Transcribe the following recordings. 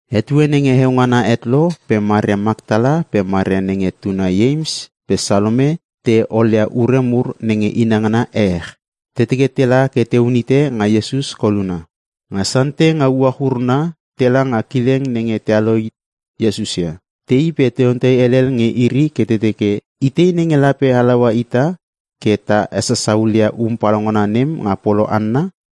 Etue nenge heo ngana het lo pe Maria Maktala pe Maria nenge tuna Ieims pe Salome te olia ure mur nenge inangana ehech. Te teke tela ke teun hite nga Iesus koluna. Nga Sande nga uach uruna tela nga kileng nenge tealo hit Iesus ia. Tei pe te ontei helel nge iri ke te teke, “Itei nenge lape halaua ita ke ta hesasa hulia um palaungana nem nga polo hanna?”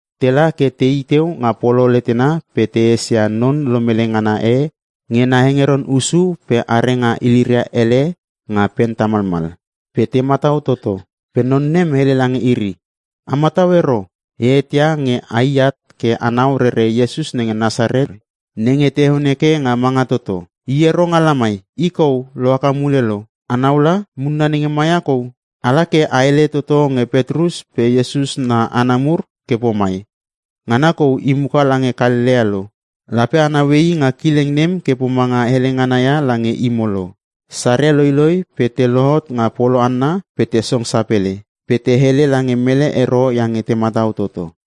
Tela ke tei teu nga polo letena pe te esia non lomele ngana e nge nena hengeron hussu pe are nga iliria hele nga pen tamalmal. Pe te matau toto. Pe non nem hele lange iri, “A matau ero! E eteia nge ai at ke anau rere Iesus nenge Nasaret nenge te heon heke nga manga toto. I ero nga lamai! I kou lohaka mule lo. Anau la, munna nenge ma ia kou! Ala ke a hele toto nge Petrus pe Iesus na hana mur ke pomai, ‘Ngana kou i muka lange Kalelea lo. Lape a naue i nga kileng nem ke pomanga hele ngana ia lange imo lo.’” Saria loiloi pe te lohot nga polo hanna pe te song sapele. Pe te hele lange mele ero iange te matau toto.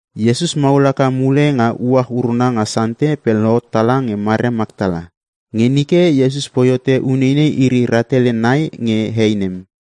Iesus maul haka mule nga uach uruna nga Sande pe lohot tala nge Maria Maktala. Nge nike, Iesus poi hote uneinei iri rahtele nai nge hei nem.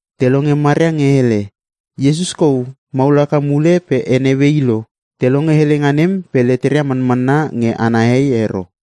Te longe Maria nge hele, “Iesus kou maul haka mule pe e neue i lo!” Te longe helenga nem pe leteria manmanna nge ana hei ero.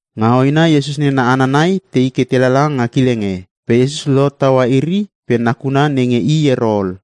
Nga hoena Iesus nena hana nai, tei ke te lala nga kileng e. Pe Iesus lohot taua iri pe nakuna nenge i ero ol.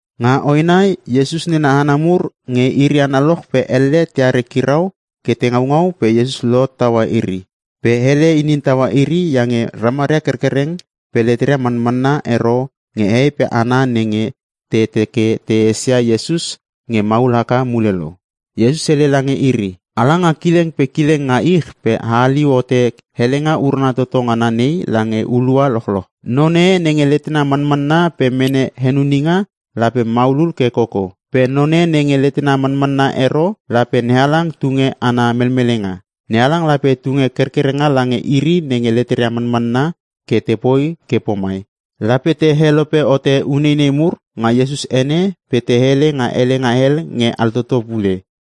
Nga hoena Iesus nena hana mur nge iri analoch pe elle teare kirau ke te ngaungau pe Iesus lohot taua iri. Pe hele inin taua iri iange ramaria kerkereng pe leteria manmanna ero nge hehei pe hana nenge te teke te esia Iesus nge maul haka mule lo. Iesus hele lange iri, “Ala nga kileng pe kileng nga ich pe a haliu hote helenga urana toto ngana nei lange hulua lochloch. Non e nenge letena manmanna pe mene henuninga, lape maulul ke koko. Pe none nenge letena manmanna ero lape NeHalang tunge ana melmelenga. NeHalang lape tunge kerkerenga lange iri nenge leteria manmanna ke tepoi ke pomai; Lape te helope hote uneinei mur nga Iesus ene pe te hele nga helenga hel nge altoto pule.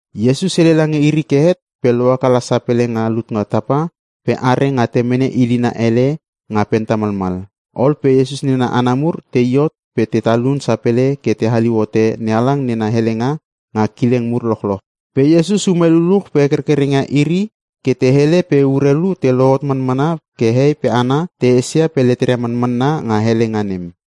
Iesus hele lange iri ke het pe lohaka la sapele nga lut nga tapa pe are nga temene ilina hele nga pen tamalmal. Ol pe Iesus nena hana mur tei hot pe te talun sapele ke te haliu hote NeHalang nena helenga nga kileng mur lochloch. Pe Iesus ume luluch pe hekerkereng ia iri ke te hele pe urelu te lohot manmana ke hehei pe hana te esia pe leteria manmanna nga helenga nem.